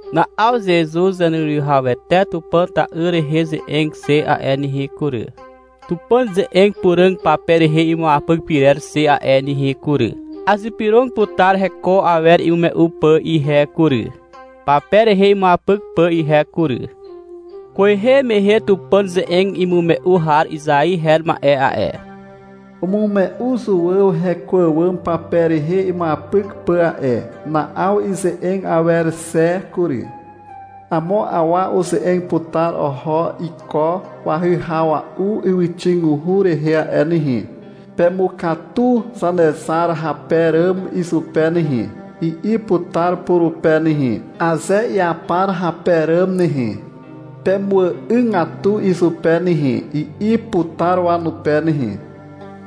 Na'aw Zezuz Zaneruwihawete Tupàn ta'yr rehe ze'eg xe a'e nehe kury, Tupàn ze'eg puràg pape rehe imuapyk pyrer xe a'e nehe kury. Azypyrog putar heko awer imume'u pà ihe kury, pape rehe imuapyk pà ihe kury. Kwehe mehe Tupàn ze'eg imume'u har Izai her ma'e a'e, umume'u Zuàw heko àwàm pape rehe imuapyk pà a'e. Na'aw ize'eg awer xe kury. Amo awa uze'eg putar oho iko wahyhawa'u ywyxiguhu rehe a'e nehe. — Pemukatu Zanezar hape ràm izupe nehe, i'i putar purupe nehe. — Aze iapar hape ràm nehe, pemuà'ygatu izupe nehe, i'i putar wanupe nehe.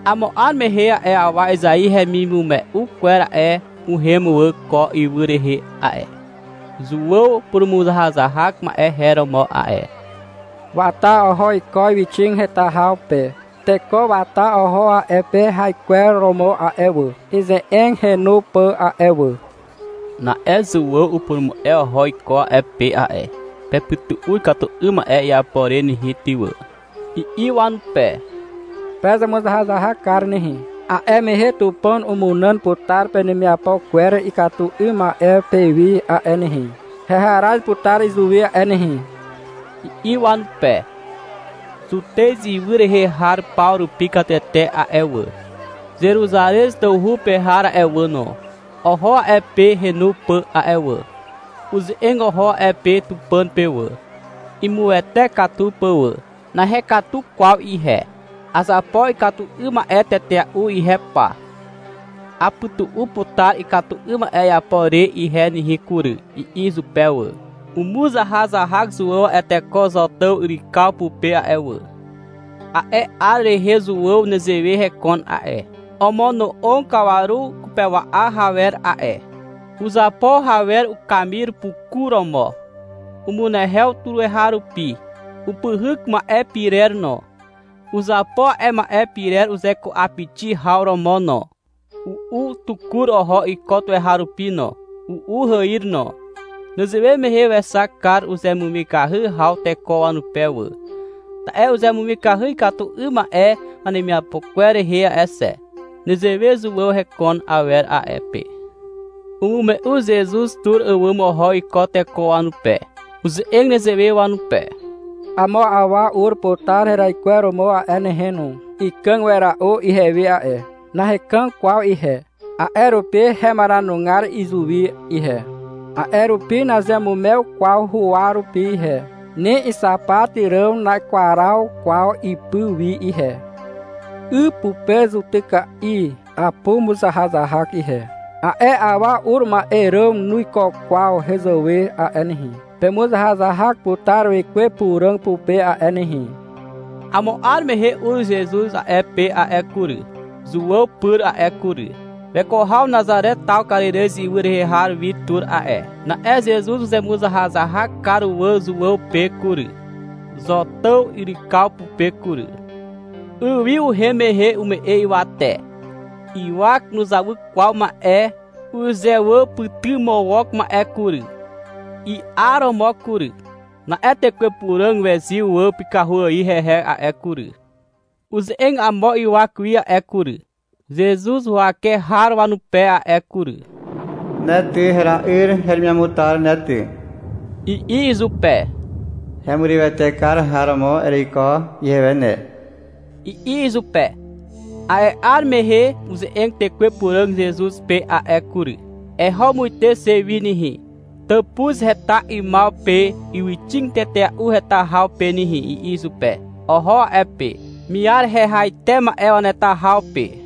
Amo 'ar mehe a'e awa Izai hemimume'u kwer a'e, uhem wà ko ywy rehe a'e. Zuàw purumuzahazahak ma'e her romo a'e. Wata oho iko ywyxig heta haw pe. Teko wata oho a'e pe haikwer romo a'e wà, ize'eg henu pà a'e wà. Na'e Zuàw upurumu'e oho iko a'e pe a'e. — Pepytu'u ikatu 'ym ma'e iapo re nehe ty wà, i'i wanupe. — Pezemuzahazahak kar nehe, a'e mehe Tupàn umunàn putar penemiapo kwer ikatu 'ym ma'e pewi a'e nehe, heharaz putar izuwi a'e nehe, i'i wanupe. Zutez ywy rehe har paw rupi katete a'e wà, Zeruzarez tawhu pe har a'e wà no, oho a'e pe henu pà a'e wà. Uze'eg oho a'e pe Tupàn pe wà, imuwete katu pà wà. — Nahekatu kwaw ihe. Azapo ikatu 'ym ma'e tetea'u ihe pa. Apytu'u putar ikatu 'ym ma'e iapo re ihe nehe kury, i'i izupe wà. Umuzahazahak Zuàw a'e teko Zotàw yrykaw pupe a'e wà. A'e 'ar rehe Zuàw nezewe hekon a'e. Omono'og kawaru kupewa'a rawer a'e. Uzapo hawer ukamir puku romo. Umunehew tuweharupi. Upyhyk ma'e pirer no. Uzapo a'e ma'e pirer uzeku'apixi haw romo no. U'u tukur oho iko tuweharupi no, u'u hàir no. (Nezewe mehe wexak kar uzemumikahy haw teko wanupe wà. Ta'e uzemumikahy ikatu 'ym ma'e wanemiapo kwer rehe a'e xe.) Nezewe Zuàw heko awer a'e pe. Umume'u Zezuz tur àwàm oho iko teko wanupe. Uze'eg nezewe wanupe. — Amo awa ur putar heraikweromo a'e nehe no. Ikàg wera'u ihewi a'e. Nahekàg kwaw ihe, a'e rupi hemaranugar izuwi ihe, a'e rupi nazeamumew kwaw huwa rupi ihe, ni ixapat hàm nakwaraw kwaw ipy wi ihe. 'Y pupe zutyka'i apumuzahazahak ihe. A'e awa ur ma'e ràm nuiko kwaw hezàwe a'e nehe. Pemuzahazahak putar Wekwe Puràg pupe a'e nehe. Amo 'ar mehe ur Zezuz a'e pe a'e kury, Zuàw pyr a'e kury. Weko haw Nazare taw Karirez ywy rehe har wi tur a'e. Na'e Zezuz uzemuzahazahak kar wà Zuàw pe kury, Zotàw yrykaw pupe kury. 'Y wi uhem mehe ume'e ywate. Ywak nuzawy kwaw ma'e uzewàpytymawok ma'e kury, i'aromo kury. Na'e Tekwe Puràg wezyw wà pykahu ài hehe a'e kury. Uze'eg amo ywak wi a'e kury, Zezuz huwake har wanupe a'e kury. — Ne, ty, hera'yr heremiamutar ne ty, i'i izupe. — Hemurywete kar har romo ereiko ihewe ne, i'i izupe. A'e 'ar mehe uze'eg Tekwe Puràg Zezuz pe a'e kury. — Eho muite xe wi nehe, tàpuz heta 'ymaw pe ywyxig tetea'u heta haw pe nehe, i'i izupe. Oho a'e pe, miar hehaite ma'e waneta haw pe.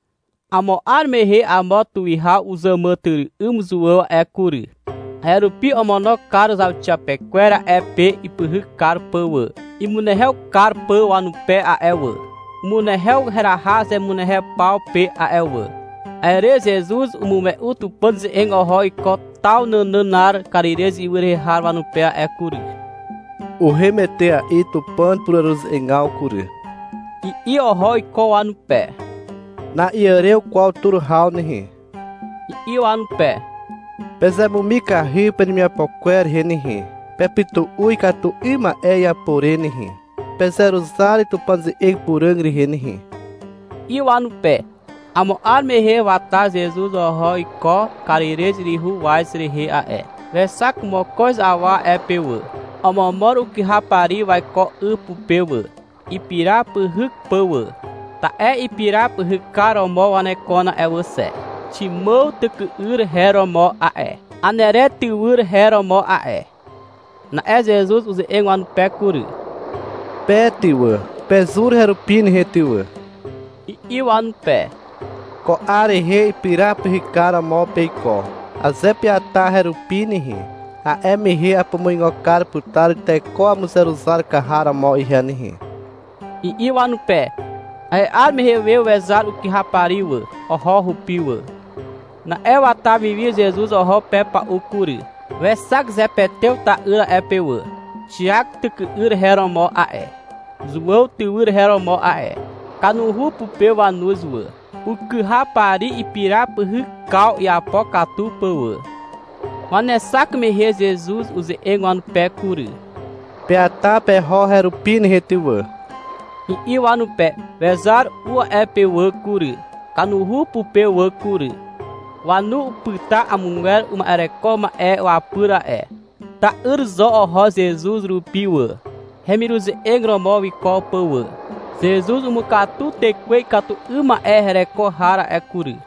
Amo 'ar mehe amo tuwihaw uzàmàtyry'ym Zuàw a'e kury. A'e rupi omono kar zauxiapekwer a'e pe ipyhyk kar pà wà, imunehew kar pà wanupe a'e wà. Umunehew heraha zemunehew paw pe a'e wà. A'e re Zezuz umume'u Tupàn ze'eg oho iko taw nànànar Karirez ywy rehe har wanupe a'e kury. — Uhem etea'i Tupàn pureruze'egaw kury, i'i oho iko wanupe. — Na'iàrew kwaw tur haw nehe, i'i wanupe. — Pezemumikahy penemiapo kwer rehe nehe, pepytu'u ikatu 'ym ma'e iapo re nehe. Pezeruzar Tupàn ze'eg puràg rehe nehe, i'i wanupe. Amo 'ar mehe wata Zezuz oho iko Karirez yryhu waz rehe a'e. Wexak mokoz awa a'e pe wà. Omomor ukyhapari waiko 'y pupe wà, ipira pyhyk pà wà. Ta'e ipira pyhykar romo wanekon a'e wà xe. Ximàw tyky'yr her romo a'e. Anere tywyr her romo a'e. Na'e Zezuz uze'eg wanupe kury. — Pe ty wà, pezur herupi nehe ty wà, i'i wanupe. — Ko 'ar rehe, ipira pyhykar romo peiko. Aze peata herupi nehe, a'e mehe apumuigo kar putar teko wamuzeruzar kar har romo ihe nehe, i'i wanupe. A'e 'ar mehe we wezar ukyhapari wà. Oho hupi wà. Na'e wata wiwi Zezuz oho pepa'u kury. Wexak Zepetew ta'yr a'e pe wà. Xiak tyky'yr her romo a'e. Zuàw tywyr her romo a'e. Kanuhu pupe wanuz wà, ukyhapari ipira pyhykaw iapo katu pà wà. Wanexak mehe Zezuz uze'eg wanupe kury. — Peata peho herupi nehe ty wà, i'i wanupe. Wezar u a'e pe wà kury, kanuhu pupe wà kury. Wanu upyta amogwer uma'ereko ma'e wapyr a'e. Ta'yr zo oho Zezuz rupi wà, hemiruze'eg romo wiko pà wà. Zezuz umukatu tekwe ikatu 'ym ma'e hereko har a'e kury.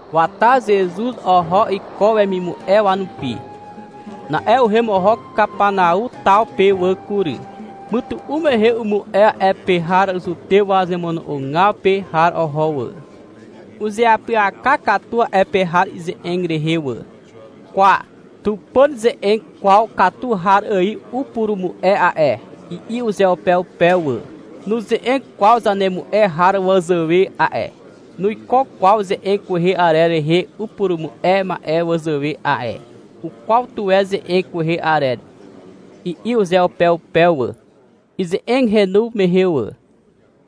Wata Zezuz oho iko wemimu'e wanupi. Na'e uhem oho Kapanau taw pe wà kury. Mytu'u mehe umu'e a'e pe har Zutew wazemono'ogaw pe har oho wà. Uzeapyaka katu a'e pe har ize'eg rehe wà. — Kwa, Tupàn ze'eg kwaw katu har ài upurumu'e a'e, i'i uzeupeupe wà. — Nuze'eg kwaw zanemu'e har wazàwe a'e. Nuiko kwaw ze'eg kwehe arer rehe upurumu'e ma'e wazàwe a'e. Ukwaw tuwe ze'eg kwehe arer, i'i uzeupeupe wà, ize'eg henu mehe wà.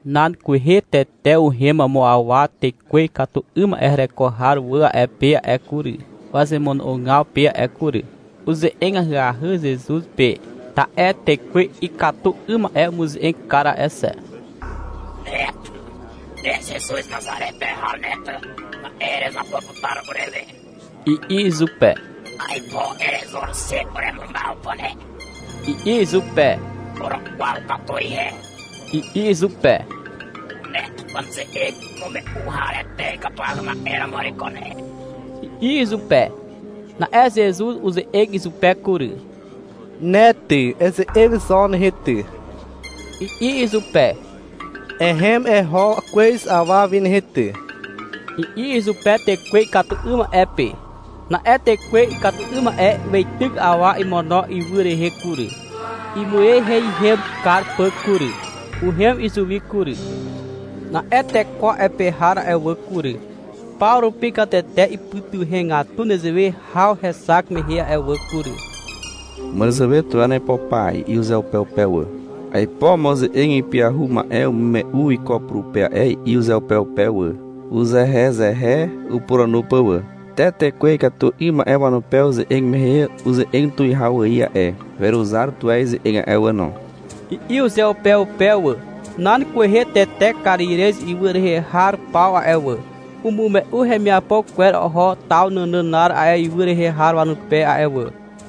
Nan kwehe tete uhem amo awa tekwe ikatu 'ym ma'e hereko har wà a'e pe a'e kury, wazemono'ogaw pe a'e kury. Uze'eg ahyahy Zezuz pe, ta'e tekwe ikatu 'ym ma'e umuze'eg kar a'e xe. — Ne ty, ne Zezuz Nazare pe har ne ty, ma'e erezapo putar urewe, i'i izupe. — Aipo erezur xe uremumaw pà ne, i'i izupe. — Urukwaw katu ihe, i'i izupe. — Ne Tupàn ze'eg imume'u harete ikatuahy ma'e romo ereiko ne, i'i izupe. Na'e Zezuz uze'eg izupe kury. — Ne ty, eze'eg zo nehe ty, i'i izupe. — Ehem eho kwez awa wi nehe ty, i'i izupe tekwe ikatu 'ym ma'e pe. Na'e tekwe ikatu 'ym ma'e weityk awa imono ywy rehe kury, imueiheihem kar pà kury. Uhem izuwi kury. Na'e teko a'e pe har a'e wà kury, paw rupi katete ipytuhegatu nezewe haw hexak mehe a'e wà kury. Upuranu tuwe uzehezehe wà. — Màràzàwe tuwe aipo pa, i'i uzeupeupe wà. — Aipo amo ze'eg ipyahu ma'e umume'u iko purupe a'e, i'i uzeupeupe wà, uzehezehe upuranu pà wà. — Te tekwe ikatu 'ym ma'e wanupe uze'eg mehe uze'eg tuwihaw ài a'e. Weruzar tuwe ize'eg a'e wà no, i'i uzeupeupe wà. Nan kwehe tete Karirez ywy rehe har paw a'e wà, umume'u hemiapo kwer oho taw nànànar a'e ywy rehe har wanupe a'e wà.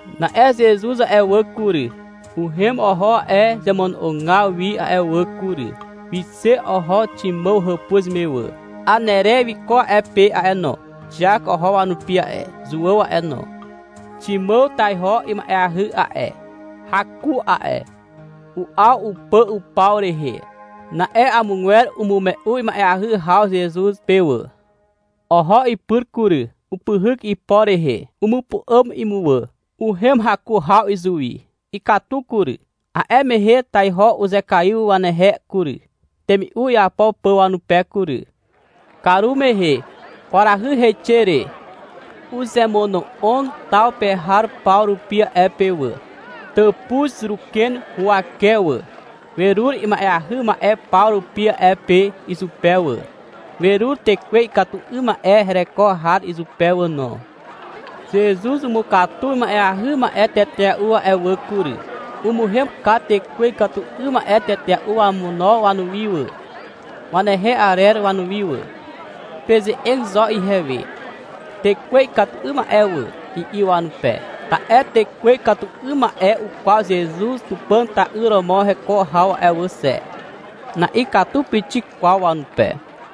Na'e Zezuz a'e wà kury, uhem oho a'e zemono'ogaw wi a'e wà kury. Wixe oho Ximàw hàpuz me wà. Anere wiko a'e pe a'e no. Xiak oho wanupi a'e, Zuàw a'e no. Ximàw taiho ima'eahy a'e. Haku a'e. U'aw upà upaw rehe. Na'e amogwer umume'u ima'eahy haw Zezuz pe wà. Oho ipyr kury. Upyhyk ipo rehe, umupu'àm imuwà. Uhem haku haw izuwi. Ikatu kury. A'e mehe taiho uzekaiw wanehe kury, temi'u iapo pà wanupe kury. Karumehe, kwarahy heixe re, uzemono'og taw pe har paw rupi a'e pe wà, tàpuz ruken huwake wà. Werur ima'eahy ma'e paw rupi a'e pe izupe wà. Werur tekwe ikatu 'ym ma'e hereko har izupe wà no. Zezuz umukatu ima'eahy ma'e tetea'u a'e wà kury. Umuhem kar tekwe ikatu 'ym ma'e tetea'u wamono wanuwi wà, wanehe arer wanuwi wà. — Peze'eg zo ihewe, tekwe ikatu 'ym ma'e wà, i'i wanupe, ta'e tekwe ikatu 'ym ma'e ukwaw Zezuz Tupàn ta'yr romo heko haw a'e wà xe. (Na'ikatu pixik kwaw wanupe.)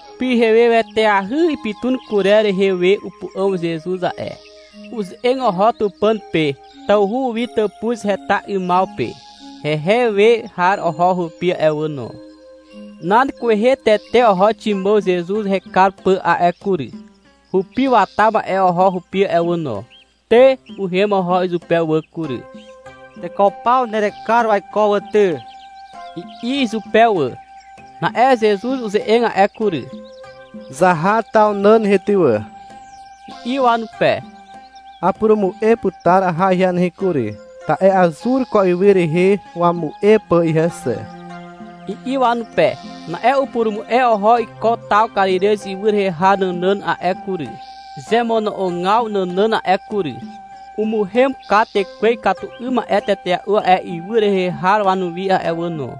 Pyheweteahy ipytun kurer rehe we upu'àm Zezuz a'e. Uze'eg oho Tupàn pe tawhu wi tàpuz heta 'ymaw pe. Hehe we har oho hupi a'e wà no. Nan kwehe tete oho Ximàw Zezuz hekar pà a'e kury. Hupi wata ma'e oho hupi a'e wà no. Te, uhem oho izupe wà kury. — Teko paw nerekar waiko wà ty, i'i izupe wà. Na'e Zezuz uze'eg a'e kury. — Zaha taw nàn nehe ty wà, i'i wanupe. — Apurumu'e putar aha ihe nehe kury. Ta'e azur ko ywy rehe wamu'e pà ihe xe, i'i wanupe. Na'e upurumu'e oho iko taw Karirez ywy rehe har nànàn a'e kury, zemono'ogaw nànàn a'e kury. Umuhem kar tekwe ikatu 'ym ma'e tetea'u a'e ywy rehe har wanuwi a'e wà no.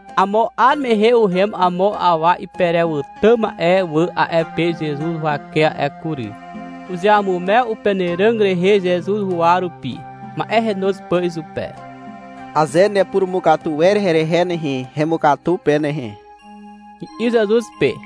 Amo 'ar mehe uhem amo awa iperewàtà ma'e wà a'e pe Zezuz huwake a'e kury. Uzeamumew upenàràg rehe Zezuz huwa rupi, ma'e henoz pà izupe. — Aze nepurumukatu wer herehe nehe, hemukatu pe nehe, i'i Zezuz pe.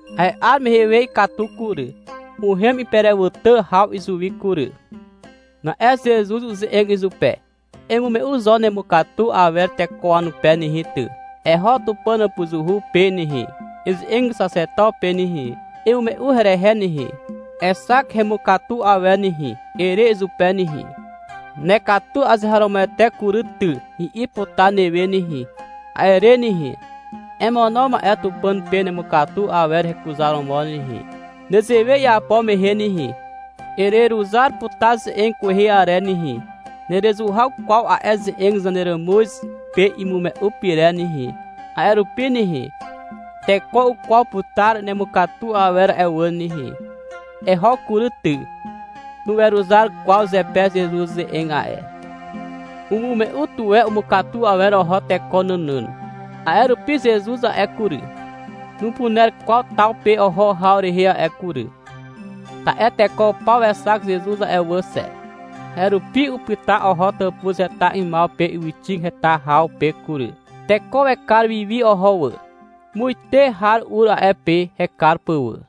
A'e 'ar mehe we ikatu kury. Uhem iperewàtà haw izuwi kury. Na'e Zezuz uze'eg izupe. — Emume'u zo nemukatu awer teko wanupe nehe ty, eho Tupàn hàpuzuhu pe nehe, eze'eg xaxeto pe nehe. — Eme'e herehe nehe, exak hemukatu awer nehe, ere izupe nehe. — Nekatu azeharomoete kury ty, i'i putar newe nehe. A'e re nehe, emono ma'e Tupàn pe nemukatu awer hekuzaromo nehe. Nezewe iapo mehe nehe, ereruzar putar ze'eg kwehe arer nehe, nerezuhaw kwaw a'e ze'eg zaneràmuz pe imume'u pyrer nehe. A'e rupi nehe, teko ukwaw putar nemukatu awer a'e wà nehe. Eho kury ty. Nuweruzar kwaw zepe Zezuz ze'eg a'e. Umume'u tuwe umukatu awer oho teko nànàn. A'e rupi Zezuz a'e kury, nupuner kwaw taw pe oho haw rehe a'e kury. Ta'e teko paw wekar Zezuz a'e wà xe. A'e rupi upyta oho tàpuz heta 'ymaw pe ywyxig heta haw pe kury. Teko wekar wi wi oho wà. Muite har ur a'e pe hekar pà wà.